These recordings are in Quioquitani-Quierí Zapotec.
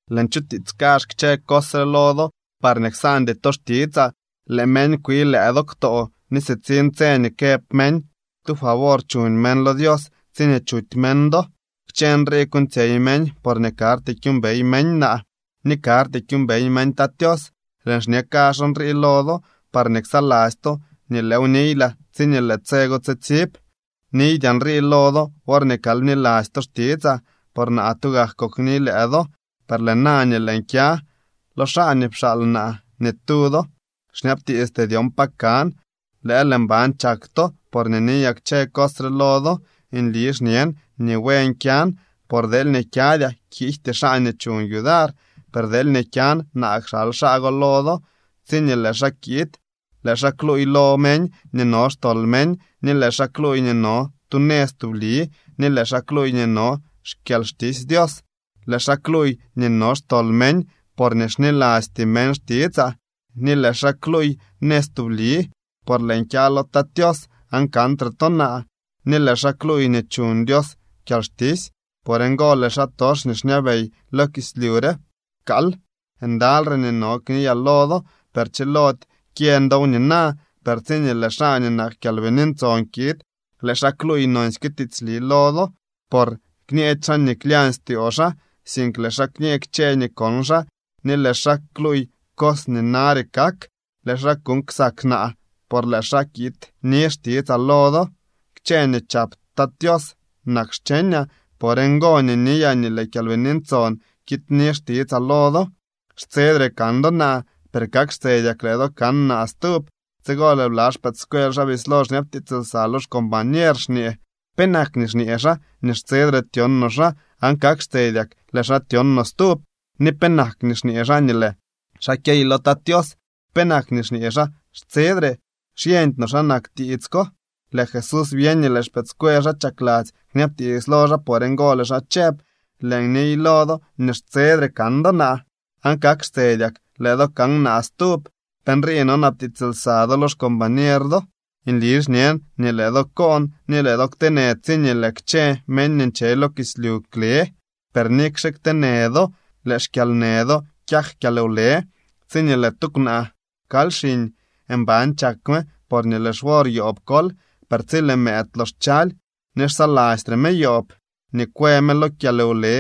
’Lëën chutiits kazh kchë cos re lo do parñee ksaandy to xtitsaa. Lëë meñ kwii lëë do ktoo ni sitsiñ tse nii këb meñ tu favor chuñ meñ lo Dios tsiñee chuty meñ do. Kchë nrii kuuñtsyey meñ porñee karty kyuumbey meñ naa ni karty kyuumbey meñ Tat Tios. Lëën xñe kazh nrii lo do parñee ksaladzy to nii lëëw niylaa tsiñee lëë tse go tsitsib. ’Niydyaa nrii lo do worñee kal bniladzy to xtitsaa, por naa tugak kokni lëë do. Per lëë na nii lëën kya lo xaa nii pxaal naa, ni tu do xñabtiisty dyon pa kan. Lëël mban chak to porñee niyaa kchë cos re lo do. Nli xñen nii buen kyan. Por deelñee kyadyaa, kiijty xaa nii chuñ yudar. Per deelñee kyan, naa kxal xaa go lo do. Tsiñee lëë xaa kiid, lëë xaa kluuy lo meñ nii no xtol meñ, ni lëë xaa kluuy nii no tu nëz tubli, ni lëë xaa kluuy nii no xkyalxtisy Dios. Lëë xaa kluuy nii no xtol meñ, porñee xnilasty meñ xtitsaa. Ni lëë xaa kluuy nëz tubli, por lëën kya lo Tat Tios, aan kantre to naa. Ni lëë xaa kluuy nii chuñ Dios kyalxtisy. Por ngo lëë xaatox nii xñabey lo kislyu re pkaal. ’Ndalyre nii no kniyaa lo do, per chilody kyeñ dow nina. Per tsiñee lëë xaa nii nak Kyalbini Ntson kiid, lëë xaa kluuy nonsyke tiitsli lo do, por kñeedy xaa nii klyañ styoo xaa, sink lëë xaa kñee kchë nii kon xaa, ni lëë xaa kluuy cos nii nare kak. Lëë xaa kuuñ ksak naa, por lëë xaa kiidni xtitsaa lo do. Kchë nii chap Tat Tios nak xcheñaa. Por ngo nii niyaa nii lëë Kyalbini Ntson kiidni xtitsaa lo do. ’Xtsedre kan do naa, per kak xtsedyak lëë do kan naa stub. Tsigo lëë bla xpëëdscuel xaa bislo xñabtiits lsa lo xcombañer xñee: —¿Penak nii xñee xaa nii xtsedre tyon no xaa, aan kak xtsedyak lëë xaa tyon no stub? ¿Ni penak nii xñee xaa nii lëë xaa kyey lo Tat Tios? ¿Penak nii xñee xaa “xtsedre”? Xyeñdy no xa nak tiits ko. Lëë Jesús byeñ nii lëë xpëëdscuel xaa chakladzy kñabtiits lo xaa. Por ngo lëë xaa chëb: —Lëën niy lo do nii xtsedre kan do naa, aan kak xtsedyak lëë do kan naa stub. ¿Pe nrii nonabtiits lsa do lo xcombañer do? Nli xñen nii lëë do koon ni lëë do kteenë tsiñee lëë kchë meñ nii nche lo kislyu kle. Per nikxe kteenë do, lëë xkyalnë do kyak kyalwle. Tsiñee lëë tu kwnaa kaly xiñ, mban chak me porñee lëë xwor yoob kol. Per tsi lëë mëëd lox chaly, ni xsalastre me yoob nii kwë me lo kyalwle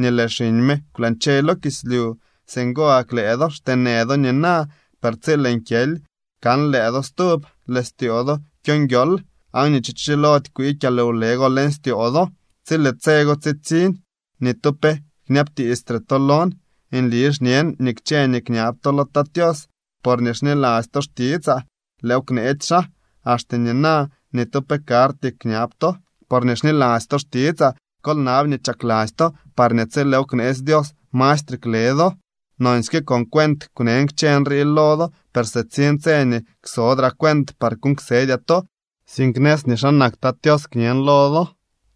nii lëë xiñ me kwlañche lo kislyu. Singo gak lëë do xteenë do nina. Per tsi lëën kyely kan lëë do stub, lëë styoo do kyo nguiool, aan ni tu cho chilody kwii kyalwle go leñ styoo do. ’Tsi lëë tse go tsitsiñ, ni tu pe kñabtiistre to lon. Nli xñen nii kchë nii kñab to lo Tat Tios porñee xniladzy to xtitsaa, lëëw kneetsy xaa. Axte nina ni tu pe karty kñab to porñee xniladzy to xtitsaa. Kol nab nii chakladzy to, parñee tsi lëëw kneetsy Dios, mastre kle do. ’Nonsyke con cuent kwnen kchë nrii lo do. Per sitsiñ tse nii ksodraa cuent par kuuñ ksedyaa to, sink nëz nii xa nak Tat Tios kñen lo do.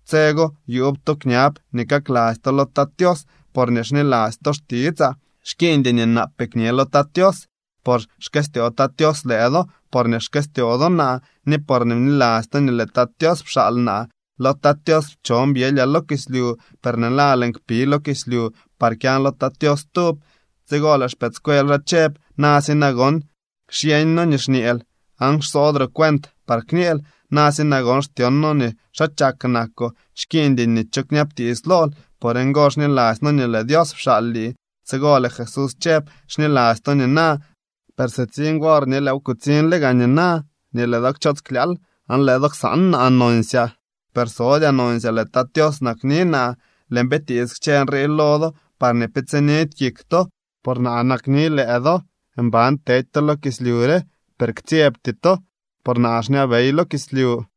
Tse go yuub to kñab nii kakladzy to lo Tat Tios porñee xniladzy to xtitsaa. Xkiiñdy nii naapee kñe lo Tat Tios. Por xkëstyoo Tat Tios lëë do, porñee xkëstyoo do naa, ni porñee bniladzy to nii lëë Tat Tios pxaal naa. Lo Tat Tios pchon byelyaa lo kislyu. Per lëë na lëën kpi lo kislyu par kyan lo Tat Tios stub. Tsigo lëë xpëëdscuel xaa chëb: —Na si nagon, xyeeñ noo nii xñeel, aan xsodroo cuent par kñeel. Na si nagon, xtyon noo nii xaa chak nakoo. Xkiiñdy nii cho kñabtiits lool. Por ngo xniladzy noo nii lëë Dios pxaal lii. Tsigo lëë Jesús chëb: —Xniladzy to nina, per sitsiñ wor ni lëëw kutsiñle gaa nina nii lëë do kchoots klyaal, aan lëë do ksaan naa nonsyaa. Per sodyaa nonsyaa, lëë Tat Tios nakni naa. Lëën bitiits kchë nrii lo do parñee pe tsinidy kik to, por naa nakni lëë do. Mban tedy to lo kislyu re, per ktsyebty to, por naa xñabey lo kislyu.